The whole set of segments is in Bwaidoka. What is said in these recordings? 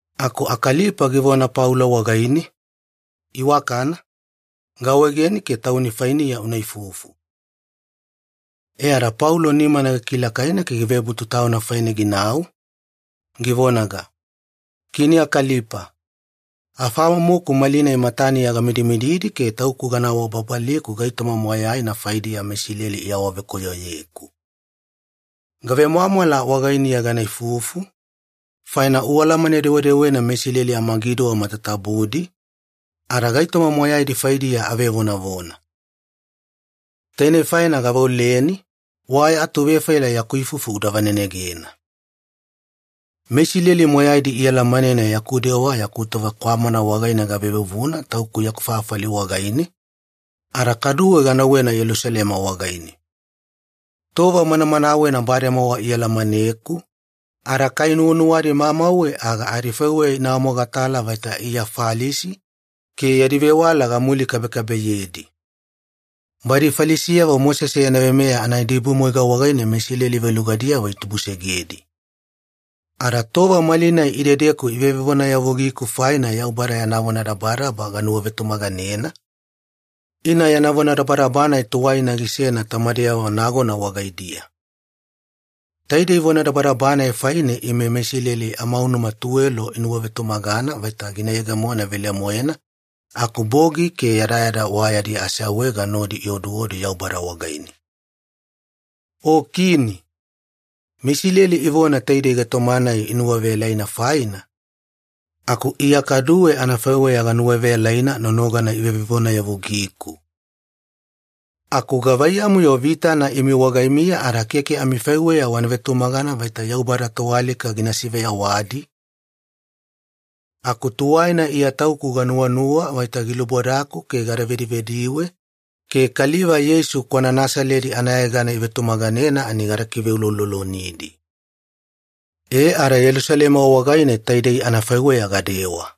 Aku Akalipa givona Paulo wagaine, “Iwakana, gaawaegeni ke tauni fainiya una ifufu.” E ada Paulo nimana gikilakaina ke givebutu tauna faine ginau, givonaga, “Kini Akalipa, afamomoku malinai mataniya gamidimididi ke tauku gana awababaliku gaitoma moyaina faidiya meIsileli iawavekoyoyeku. Gavemwamwala wagainiya gana ifufu, faina ualamane-dewedewena meIsileli amagiduwa matatabudi, ada gaitoma moyaidi faidiya avevonavona. Tainei faina gaveoleni, wa ya atuvefaila yaku ifufu uda vanenegena. “MeIsileli moyaidi ialamanena yaku dewa yaku tova kwamana wagaine gavevuvuna tauku yaku fafali wagaine, ada kaduwe ganauwena Yelusalema wagaine. Tova manamanawena bademowa ialamaneku, ada kai nuwanuwadi mamauwe aga adifaiweya ina awamogatala vaita Iya Falisi ke yadi vewala gamulikabekabeyedi. Badi Falisiyavo Mosese yana veimeya anaidibumwaiga wagaine meIsileli velugadiyavo itubusegedi. Ada tova malinai idedeku ivevevonayavugiku faina Yaubada yana vonadabadaba ganuwavetumaganena, ina yana vonadabadaba-nai tuwaina gisena tamameyavo nagona wagaidiya. Taidei vonadabadaba-nai faine ime meIsileli amaunuma tuwelo inuwavetumagana vaita gina yegemona velemoena aku bogi ke yadayada wa yadi aseawaega nodi ioduodu Yaubada wagaine. O Kini, meIsileli ivona taidei gaitoma-nai inuwaveyalaina faina, aku Iya kaduwe anafaiweya ganuwaveyalaina nonogana ivevevonayavugiku. Aku gavaiyamu-yo vitana imi wagaimiya ada keke amifaiweya wana vetumagana vaita Yaubada toalika gina siveyawadi? “Aku tuwaina Iya tauku ganuwanuwa vaita gilubodaku ke gada vedivediwe ke kaliva Yeisu kwana Nasaledi anayegana ivetumaganena ani gada kiveuloulolonidi. E ada Yelusalema wagaine taidei anafaiweya gadewa.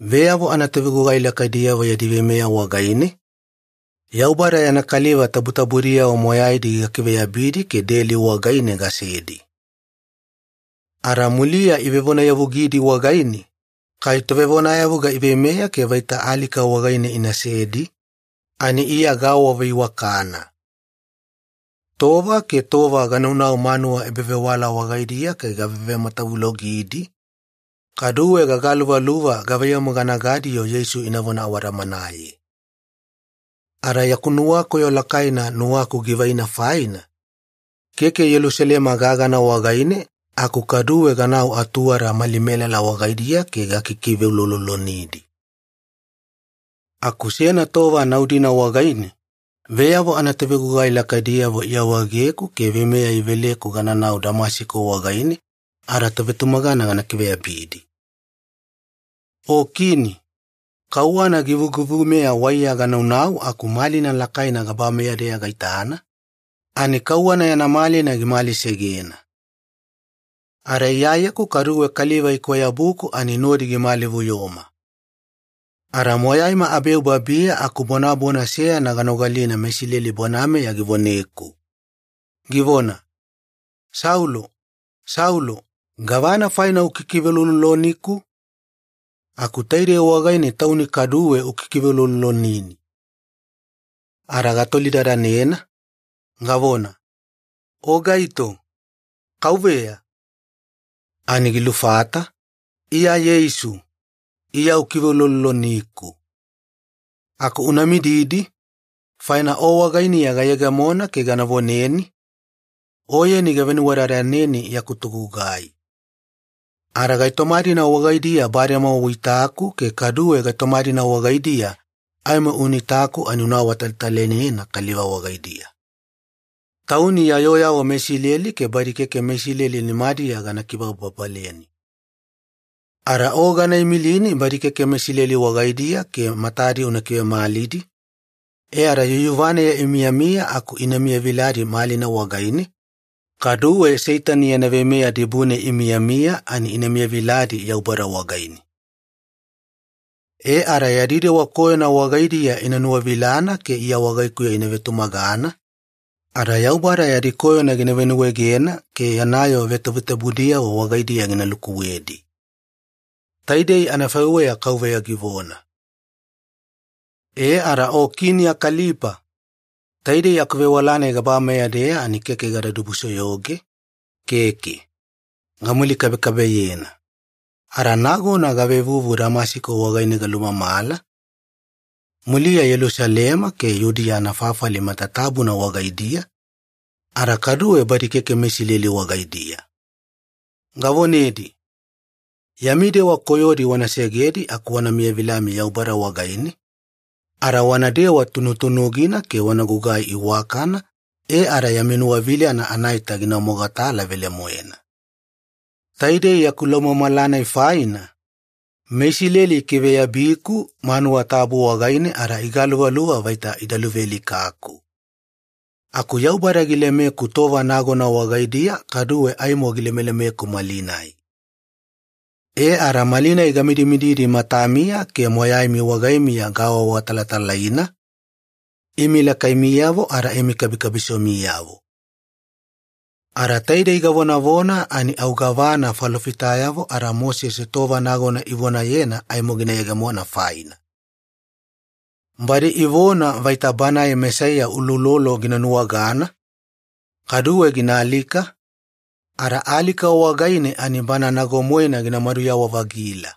Veyavo anatovegugai lakaidiyavo yadi veimeya wagaine, Yaubada yana kaliva tabutabudiyavo moyaidi gakiveyabidi ke deli wagaine gasedi. Ada muliya ivevonayavugidi wagaine, kai tovevonayavuga iveimeya ke vaita alika wagaine inasedi, ani Iya gaawaveiwakana. Tova ke tova ganaunau manuwa ebavewala wagaidiya ke gavevematavulogidi, kaduwe gagaluvaluva gavaiyamu gana gadi-yo Yeisu inavona awadamanaye. Ada yaku nuwakoyo lakaina nuwaku givaina faina, keke Yelusalema gagana wagaine aku kaduwe ganau atuwada mali melala wagaidiya ke gakikiveuloulolonidi. “Aku seyana tova nau-dina wagaine, veyavo anatovegugai lakaidiyavo iawaegeku ke veimeya iveleku gananau Damasiko wagaine ada tovetumagana gana kiveyabidi. O Kini, kauwana givugivumeya waiya ganaunau aku malina lakaina gabameya-deya gaitana, ani kauwana yana malina gimalisegena. Ada Iyayeku kaduwe kaliva ikwayabuku ani nodi gimalivuyoma. Ada moyaima abeu babiya aku bonabona seyana ganogalina meIsileli bonameya givoneku, givona, ‘Saulo, Saulo, gavana faina ukikiveulouloloniku? Aku taidei wagaine tauni kaduwe ukikiveuloulolonini.’ “Ada gatolidadanena, gavona, ‘O gaito, Kauveya?’ “Ani gilufata, ‘Iya Yeisu, Iya ukiveulouloloniku. Aku una mididi, faina o wagainiya gayegemona ke gana voneni, oyeni gavenuwadadaneni yaku togugai. Ada gaitoma-dina wagaidiya bademowa uitaku ke kaduwe gaitoma-dina wagaidiya aimo una itaku ani una awatalatalainena kaliva wagaidiya. Tauni ya yooyavo meIsileli ke badi keke meIsileli nimadiya gana kibababaleni. Ada o gana imilini badi keke meIsileli wagaidiya ke matadi una kivemalidi, e ada yuyuvaneya imiyamiya aku ina miyaviladi malina wagaine, kaduwe Seitani yana veimeya dibune imiyamiya ani ina miyaviladi Yaubada wagaine. E ada yadi dewa koyona wagaidiya ina nuwavilana ke Iya wagaikuya ina vetumagana, ada Yaubada yadi koyona gina venuwaegena ke yana yoo vetavetabudiyavo wagaidiya gina lukuwedi.’ Taidei anafaiweya Kauveya givona. “E ada o Kini Akalipa, taidei akuvewala-nai gabameya-deya ani keke gada dibusoyoge, keke. Gamulikabekabeyena. Ada nagona gavevuvu Damasiko wagaine galumamala, muliya Yelusalema ke Yudiya anafafali matatabuna wagaidiya, ada kaduwe badi keke meIsileli wagaidiya. Gavonedi, ‘Yami dewa koyodi wana segedi aku wana miyavilami Yaubada wagaine, ada wanadewa tunutunugina ke wana gugai iwakana e ada yami nuwavilana anaita gina mogatala velemoena.’ Taidei yaku laumamala-nai faina, meIsileli ikiveyabiku manuwa tabu wagaine ada igaluvaluva vaita ida luvealikaku. Aku Yaubada gilemeku tova nagona wagaidiya, kaduwe aimo gilemelemeku malinai. E ada malinai gamidimididi matamiya ke moyaimi wagaimiya gaawaawatalatalaina, imi lakaimiyavo ada imi kabisomiyavo. Ada taidei gavonavona ani au gavana falofitayavo ada Mosese tova nagona ivonayena aimo gina yegemo faina. Badi ivona vaita Banae Mesaiya uloulolo gina nuwagana, kaduwe gina alika, ada alika wagaine ani Bana nago-moena gina maduyawa-vagila.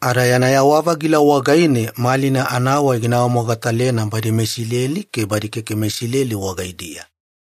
Ada yana yawa-vagila wagaine malina anawai gina awamogatalena badi meIsileli ke badi keke meIsileli wagaidiya.”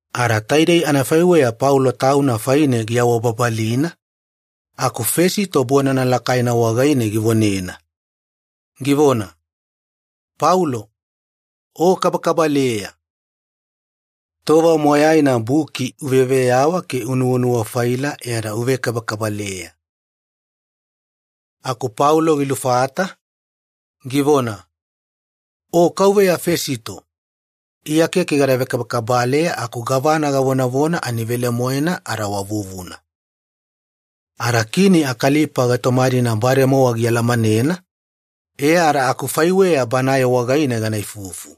Ada taidei anafaiweya Paulo tauna faine giawababalina, aku Fesito bonana lakaina wagaine givonena, givona, “Paulo, o kabakabaleya! Tova moyaina buki uveyaveyawa ke unuwanuwa-faila e ada uvekabakabaleya.” Aku Paulo gilufata, givona, “O Kauveya Fesito, Iya keke gada vekabakabaleya aku gavana gavonavona ani velemoena ada wa vuvuna. Ada Kini Akalipa gaitoma-dina bademowa gialamanena, e ada akufaiweya banae wagaine gana ifufu.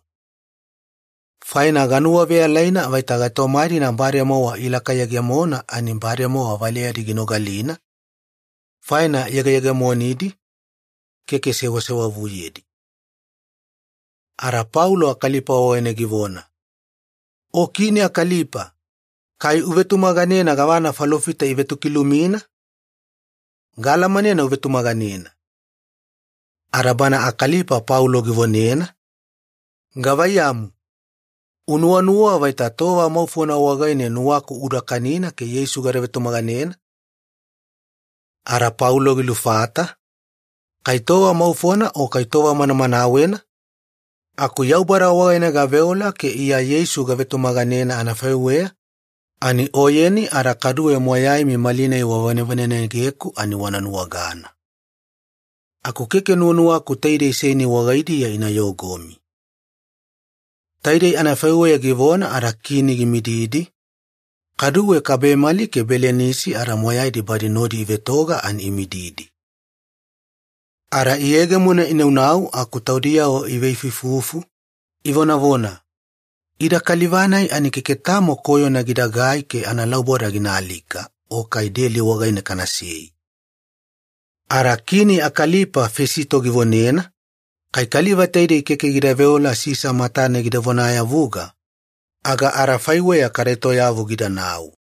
Faina ganuwaveyalaina vaita gaitoma-dina bademowa ilakayegemona ani bademowa valeyadi ginogalina, faina yegeyegemonidi, keke sewasewavuyedi.” Ada Paulo Akalipa wagaine givona, “O Kini Akalipa, kai uvetumaganena gavana falofita ivetokilumina? Gaalamanena uvetumaganena.” Ada bana Akalipa Paulo givonena, “Gavaiyamu, unuwanuwa vaita tova maufona wagaine nuwaku uda kanina ke Yeisu gada vetumaganena?” Ada Paulo gilufata, “Kai tova maufona o kai tova manamanawena, aku Yaubada wagaine gaveola ke Iya Yeisu gavetumaganena anafaiweya ani oyeni ada kaduwe moyaimi malinai wavanevanenegeku ani wana nuwagana. Aku keke nuwanuwaku taidei seini wagaidiya ina yogomi.” Taidei anafaiweya givona ada Kini gimididi, kaduwe kabemali ke Belinisi ada moyaidi badi nodi ivetoga ani imididi. Ada iyegemona inaunau aku taudiyavo iveifuifufu, ivonavona, “Ida kaliva-nai ani keke tamo koyona gidagai ke analauboda gina alika o kai deli wagaine kanasei.” Ada Kini Akalipa Fesito givonena, “Kai kaliva taidei keke gida veola Sisa matane gida vonayavuga, aga adafaiweya kada etoyavu gidanau.”